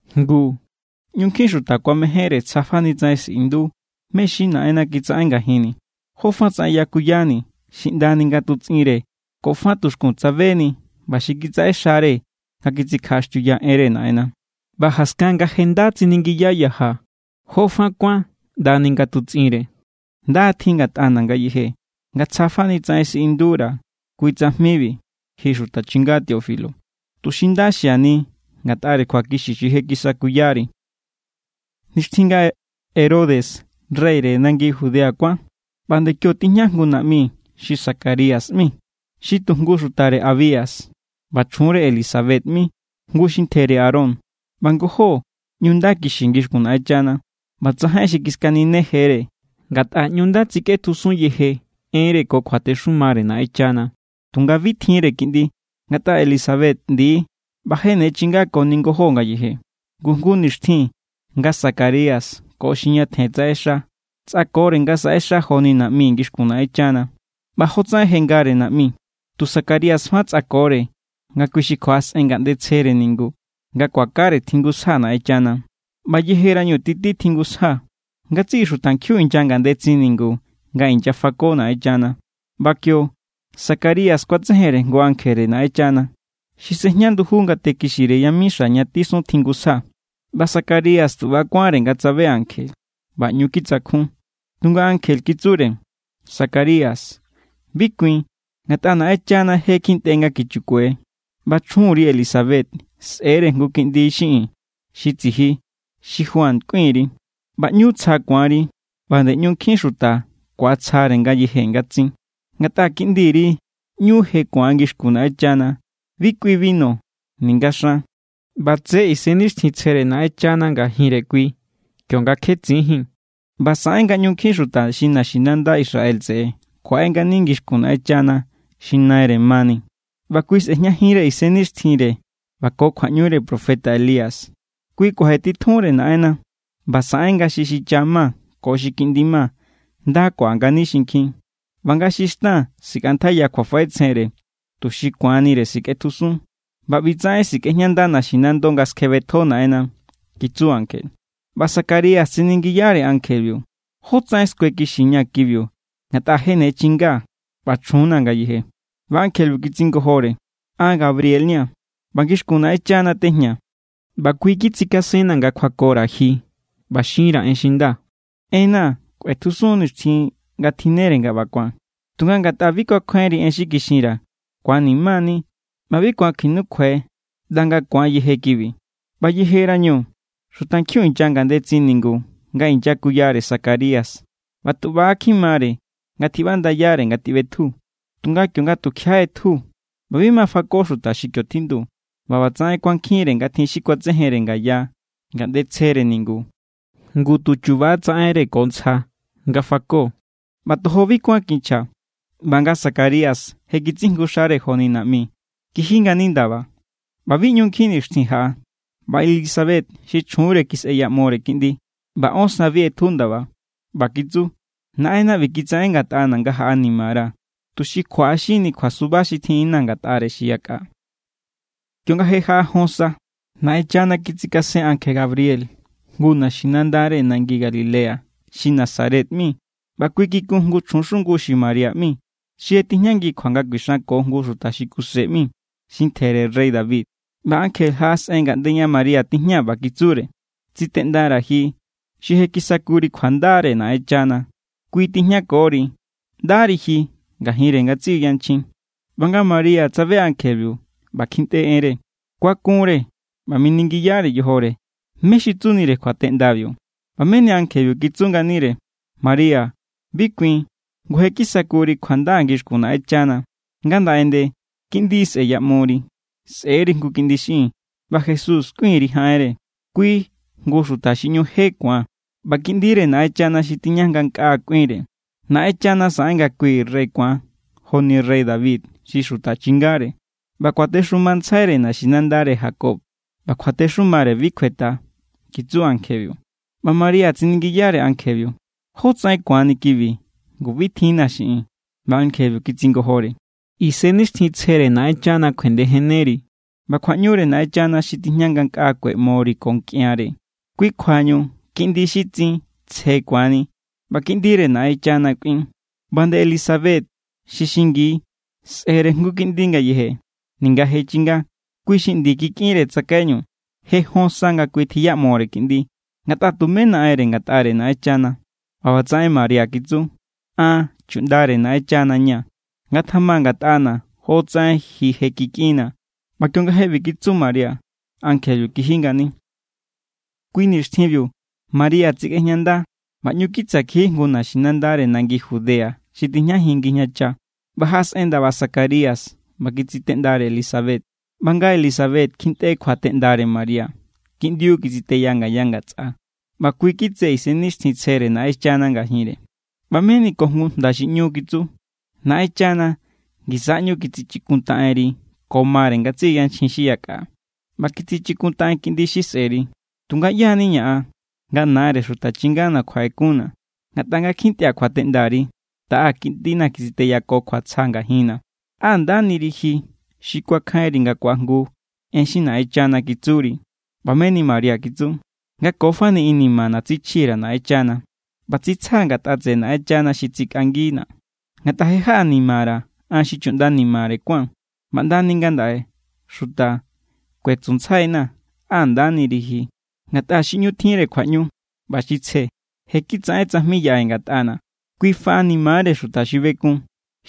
Ngu ꞌñu nkjin xuta kuamejénre tsja fani tsaꞌen siꞌindu mé= xi Naꞌenna kitsaꞌen ngajinni̱, jo fa tsaꞌen yakuyani̱ xi ꞌndani nga tutsꞌinre ko fa tuxkun tsabenii̱ ꞌba xi kitsaꞌexare nga kitsikjaꞌaxtiuya enre Naꞌenna. ꞌBa jaskan nga je nda tsiningiya yajaa̱ jó fa kuán ꞌndani nga tutsꞌinre, nda= tjin ngatꞌana̱ ngayeje nga tsja fani tsaꞌen siꞌindura̱ kui tsajmibi ji xuta chinga Teófilo, tuxi nda xiani ngatꞌare kjuakixi xi je kisakuyari. Nixtjin nga Herodes reyre nangi Judea kuán, ꞌba nde kio tijña jngu naꞌmi xi Zacarías ꞌmi, xi tu jngu xutare Abías. ꞌBa chjunre Elisabet ꞌmi, jngu xi ntjere Aarón. ꞌBa ngojó ꞌñu nda kixi ngixkun Naꞌenchana, ꞌba tsajain xi kiskaninejere, ngatꞌa ꞌñu nda tsikꞌetjusun yeje enre ko kjuatexumare Naꞌenchana. Tunga bi tjinre kiꞌndi, ngatꞌa Elisabet ꞌndi=; ꞌba je ne chinga koni ngojó ngayeje. Ngu jngu nixtjin nga Zacarías ko xi ñatjen tsaꞌexa tsꞌakore nga saꞌexa joni naꞌmi ngixkun Naꞌenchana, ꞌba jotsaꞌen je ngare naꞌmi, tu Zacarías fa tsꞌakore nga kui xi kjuaꞌasꞌen ngaꞌnde tsjere ningu nga kuakare tjingusja Naꞌenchana. ꞌBa yejerañu titi tjingusja, ngatsiꞌi xutankjiun inya ngandetsin ningu nga inyafako Naꞌenchana. ꞌBa kio, Zacarías kuatsejenre jngu ankjere Naꞌenchana, xi sejña nduju ngate kixire yamixa ña tisun tjingusja. ꞌBa Zacarías tu ꞌba= kuánre nga tsabe ankje, ꞌba ꞌñu kitsakjun. Tunga ankje kitsure: —Zacarías, bi kuin, ngatꞌa Naꞌenchana je kjintꞌe nga kichukue, ꞌba chjunri Elisabet sꞌe̱re jngu kiꞌndi xiꞌin xi tsiji xi Juan kꞌuin_ri. ꞌBa ꞌñu tsja ku̱anri, ꞌba nde ꞌñu nkjin xuta ku̱atsjare ngayeje nga tsin, ngatꞌa kiꞌndiri ꞌñu je ku̱an ngixkun Naꞌenchana. Bi kꞌui binu ninga xan ꞌba tse Isennixtjintsjere Naꞌenchana ngajinre kui kionga kje tsinjín. ꞌBa saꞌen nga ꞌñu nkjin xuta xi naxinanda Israel tseꞌe kjuaꞌe ngani ngixkun Naꞌenchana xi Naire mani. ꞌBa kui sejñajinre isennixtjinre ꞌba ko kjuaꞌñure profeta Elías. Kui kuajetitjunre Naꞌenna, ꞌba saꞌen nga xi xicha ma ko xi kiꞌndi ma nda kuaꞌa ngani xinkjin, ꞌba nga xi xtan sikꞌantjaiya kjuafaꞌetsjenre tuxi ku̱anire sikꞌetjusun. ꞌBa ꞌbitsaꞌen sikꞌejñanda naxinando nga skjebetjo Naꞌenna —kitsu ankje. ꞌBa Zacarías tsiningiyare ankjebiu: —¿Jótsaꞌen skuekixiña̱ kibiu? Ngatꞌa je ne chingaa̱, ꞌba chjunna̱ ngayeje. ꞌBa ankjebiu kitsingojore: —An Gabriel= ña̱, ꞌba ngixkun Naꞌenchana tejñaa̱; ꞌba kui kitsikasenna̱ nga kjuakora̱ ji ꞌba xinra̱ en xi nda. Enna̱ kꞌuetjusun nixtjin nga tjinnere nga ꞌba ku̱an. Tunga ngatꞌa bi kuakjainri en xi kixinra̱, ku̱anima=ni ꞌba bi ku̱an kuinukjuai ꞌnda nga ku̱an yeje kibi. ꞌBa yejerañu, xutankjiun inya ngandetsin ningu nga inyakuyare Zacarías ꞌba tu ꞌba= kjimare nga tjiꞌbandayare nga tjiꞌbetju. Tunga kionga tukjiaꞌa ꞌetju, ꞌba bi ma fako xuta xi kio tjindu; ꞌba ꞌbatsaꞌen kuankjinre nga tjin xi kuatsejenre ngaya ngaꞌnde tsjere ningu, ngu tu chuba= tsaꞌenre ko ntsja nga fako. ꞌBa tojo bi kuán kinchja. ꞌBa nga Zacarías je kitsijngu xare joni naꞌmi, kiji ngani ndaba. ꞌBa bi ꞌñu nkjin nixtjin jaꞌa, ꞌba Elisabet xi chjunre kisꞌeyaꞌmore kiꞌndi, ꞌba ón sa bi ꞌetju ndaba. ꞌBa kitsu: “Naꞌenna ꞌbi kitsaꞌen ngatꞌana̱ nga jaꞌanimara̱, tuxi kjuaꞌaxinni kjuasuba xi tjinꞌinna̱ ngatꞌare xi yakꞌa.” Kionga je jaꞌa jon sa, Naꞌenchana kitsikasen ankje Gabriel jngu naxinandare nangi Galilea xi Nazaret ꞌmi. ꞌBa kui kikun jngu chjun xungu xi María ꞌmi xi je tijñangi kjua nga kuixanko jngu xuta xi Kuse ꞌmi, xi ntjere rey David. ꞌBa ankje jaꞌasꞌen ngaꞌnde ña María tijña, ꞌba kitsure: —Tsiteꞌndara̱ ji xi je kisakuri kjuandare Naꞌenchana. Kui= tijñakori. ¡Ndari ji ngajinre ngatsiꞌi yanchjin! ꞌBa nga María tsabe ankjebiu ꞌba kjintꞌe enre, kuakunre ꞌba miningiyare yojore mé= xi tsunire kjuateꞌndabiu. ꞌBa meni ankjebiu kitsu nganire: —María, bi kuin. Ngu je kisakuri kjuanda ngixkun Naꞌenchana. Ngandaꞌe nde kiꞌndi sꞌe̱yaꞌmori: sꞌe̱=ri jngu kiꞌndi xiꞌin, ꞌba Jesús kꞌuin_ri jaꞌenre. Kui jngu xuta xi ꞌñu je ku̱an, ꞌba Kiꞌndire Naꞌenchana xi tijña ngankꞌaa kꞌuinre. Naꞌenchana saꞌen nga kui rey ku̱an joni rey David xi xuta chingare. ꞌBa kuatexumantsjaire naxinandare Jacob, ꞌba kjuatexumare bi kjuetꞌa —kitsu ankjebiu. ꞌBa María tsiningiyare ankjebiu: —¿Jótsaꞌen ku̱anni kibi? Ngu bi tjinna̱ xiꞌin. ꞌBa ankjebiu kitsingojore: —Isennixtjintsjere Naꞌenchana kjuendejenneri, ꞌba kjuaꞌñure Naꞌenchana xi tijña ngankꞌa kueꞌmori ko nkꞌianre. Kui kjuañu kiꞌindi xi tsin tsje ku̱anni, ꞌba Kiꞌndire Naꞌenchana kꞌuin. ꞌBa nde Elisabet, xi xingi, sꞌe̱re jngu kiꞌndi ngayeje, ninga je chinga. Kui xi ꞌndi kikꞌinre tsakaiñu je jon sa nga kui tjiꞌyamore kiꞌndi. Ngatꞌa tumé naꞌenre ngatꞌare Naꞌenchana. ꞌBa ꞌbatsaꞌen María kitsu: —An chuꞌndare Naꞌenchana= ña̱. Ngatjama ngatꞌana̱ jotsaꞌen ji je kikꞌinnaa̱. ꞌBa kionga je ꞌbi kitsu María, ankjebiu kiji ngani. Kui nixtjinbiu, María tsikꞌejñanda ꞌba ꞌñu kitsa kiji jngu naxinandare nangi Judea xi tijñajin ngijñacha. ꞌBa jaꞌasꞌen ndaba Zacarías ꞌba kitsiteꞌndare Elisabet. ꞌBa nga Elisabet kjintꞌe kjuateꞌndare María, kiꞌndiu kitsiteya ngaya ngatsꞌa, ꞌba kui kitse Isennixtjintsjere Naꞌenchana ngajinre. ꞌBa meni ko jngu jnda xi ꞌñu, kitsu: —¡Naꞌenchana ngisa ꞌñu kitsichikuntaꞌenri ko mare ngatsiꞌi yanchjin xi yakꞌa, ꞌba kitsichikuntaꞌen kiꞌndi xi sꞌe̱ri! Tunga, ¿ꞌyá= nina̱ an, nga nare Xuta chingana̱ kjuaꞌekunna̱? Ngatꞌa nga kjintꞌia̱ kjuateꞌndari, taꞌa kiꞌndina̱ kitsiteya ko kjuatsja ngajinna̱. ¡Á ndaniri ji xi kuakjainri nga ku̱ajngu en xi Naꞌenchana kitsuri! ꞌBa meni María kitsu: Nga ko fani inimana̱ tsichji_ra̱ Naꞌenchana, ꞌba tsitsjaa̱ ngatꞌa tseꞌe Naꞌenchana xi tsikꞌangina̱. Ngatꞌa je jaꞌanimara̱, an xi chuꞌnda nimare kuán, ꞌba ꞌndani ngandaꞌe xuta kuetsuntsjaina̱: “Á ndaniri ji.” Ngatꞌa xi ꞌñu tjinre kjuaꞌñu ꞌba xi tsje je kitsaꞌen tsajmi yaꞌe ngatꞌana̱. Kui faꞌanimare xuta xi bekun,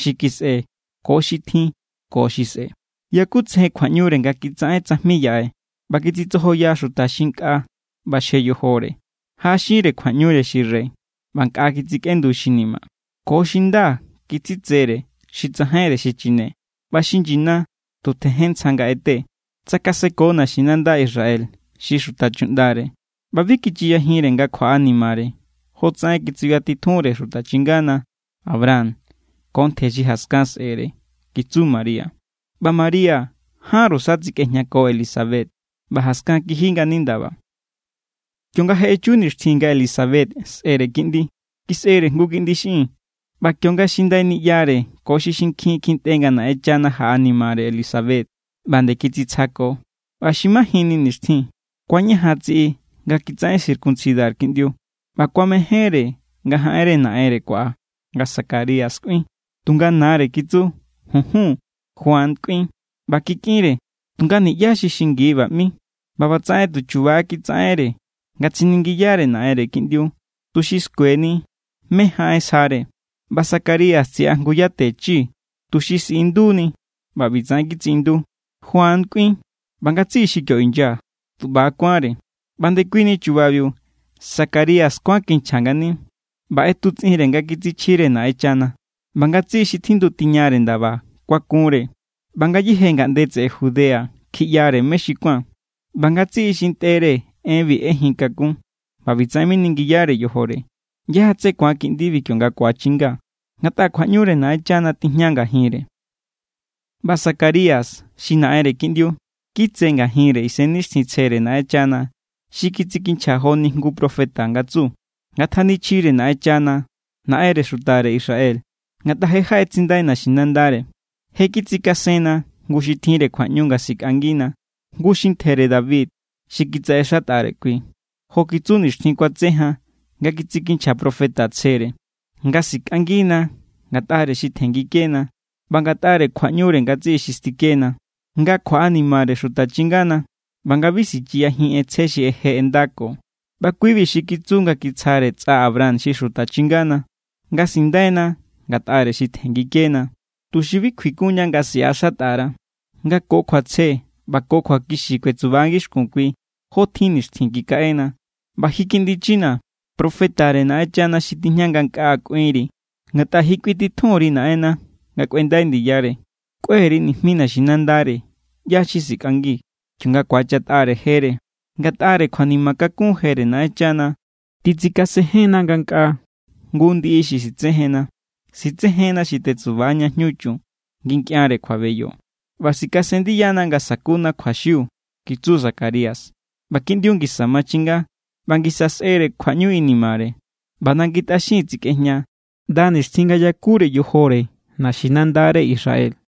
xi kisꞌe ko xi tjin ko xi sꞌe̱. Yakutsejen kjuaꞌñure nga kitsaꞌen tsajmi yaꞌe, ꞌba kitsitsojoya xuta xi nkꞌa ꞌbaxje yojore. Jaꞌaxinre kjuaꞌñure xi rey, ꞌba nkꞌa kitsikꞌendu xi ni̱ma̱. Ko xi nda kitsitsere xi tsajainre xi chine, ꞌba xi nyina tu tjejen ntsja nga ꞌete. Tsakaseko naxinanda Israel, xi xuta chuꞌndare, ꞌba bi kichiyajinre nga kjuaꞌanimare jotsaꞌen kitsuyatitjunre xuta chingana Abraham ko ntje xi jaskan sꞌe̱re kitsu María. ꞌBa María jánru sa tsikꞌejñako Elisabet, ꞌba jaskan kiji ngani ndaba. Kionga je echu nixtjin nga Elisabet sꞌe̱re kiꞌndi, kisꞌere jngu kiꞌndi xiꞌin. ꞌBa kionga xi ndai niꞌyare ko xi xinkjin kjintꞌe nga Naꞌenchana jaꞌanimare Elisabet, ꞌba nde kitsitsjako. ꞌBa xi majinni nixtjin, kuañajan tsiꞌi nga kitsaꞌen circuncidar kiꞌndiu, ꞌba kuamejénre nga jaꞌenre naꞌenre kuaꞌa, nga Zacarías kꞌuin. Tunga nare kitsu: —Junjun. Juan kꞌuin. ꞌBa kikꞌinre: —Tunga niꞌyá xi xingi ꞌba ꞌmi. ꞌBa ꞌbatsaꞌen tu chuba= kitsaꞌenre nga tsiningiyare naꞌenre kiꞌndiu, tuxi skueni mé= jaꞌen sjare. ꞌBa Zacarías tsiꞌa jngu yate chi tuxi siꞌinduni ꞌba ꞌbitsaꞌen kitsiꞌindu: “Juan kꞌuin.” ꞌBa ngatsiꞌi xi kio inya tu ꞌba= kuánre. ꞌBa ndekuini chubabiu Zacarías kuán kinchja ngani ꞌba ꞌetutsꞌinre nga kitsichjire Naꞌenchana. ꞌBa ngatsiꞌi xi tjindu tiña ndaba kuakunre, ꞌba ngayéje ngaꞌnde tseꞌe Judea kjiꞌyare mé= xi kuán. ꞌBa ngatsiꞌi xi ntꞌere enbi ꞌejin kakun, ꞌba ꞌbitsaꞌen miningiyare yojore: “¿ꞌYá= tsé ku̱an kiꞌndibi kionga ku̱achinga? Ngatꞌa kjuaꞌñure Naꞌenchana tijña ngajinre.” ꞌBa Zacarías, xi naꞌenre kiꞌndiu, kitse ngajinre Isennixtjintsjere Naꞌenchana xi kitsikinchja joni jngu profeta nga tsu: Ngatjanichjire Naꞌenchana, Naꞌenre xutare Israel, ngatꞌa je jaꞌetsindai naxinandare. Je kitsikasenna jngu xi tjinre kjuaꞌñu nga sikꞌangina, jngu xi ntjere David xi kitsaꞌexatꞌare kui. Jo kitsu nixtjin kuatse jan nga kitsikinchja profeta tsjere nga sikꞌangina ngatꞌare xi tjenngikena ꞌba ngatꞌare kjuaꞌñure ngatsiꞌi xi stikena, nga kjuaꞌanimare xuta chingana, ꞌba nga bi sichiyajin ꞌentsje xi je ꞌendako. ꞌBa kui=bi xi kitsu nga kitsjare tsꞌa Abraham xi xuta chingana, nga sindaina ngatꞌare xi tjenngikena, tuxi bi kjuikunña nga siꞌaxatꞌa_ra, nga ko kjuatsje ꞌba ko kjuakixi kuetsuba ngixkun kui jotjin nixtjin kikaꞌena. ꞌBa ji, kiꞌndi china̱, profetare Naꞌenchana xi tijña ngankꞌaa kꞌuinri. Ngatꞌa ji kꞌuintitjun_ri Naꞌenna nga kꞌuendai ndiyare. Kꞌue_ri nijmi naxinandare ꞌyá xi sikꞌangi, kionga ku̱achatꞌare jere. Ngatꞌare kjuanima kakun jere Naꞌenchana, titsikasenjenna ngankꞌaa jngu ndiꞌi xi sitsejenna. Sitsejenna xi tetsuba ña jñu chun, ngi nkꞌianre kjuabeyo, ꞌba sikasen ndiyana nga sakuna kjuaxiu kitsu Zacarías. ꞌBa kiꞌndiu ngisa machinga ꞌba ngisa kisꞌere kjuaꞌñu inimare. ꞌBa nangi tꞌaxin tsikꞌejña ꞌnda nixtjin nga yakure yojore naxinandare Israel.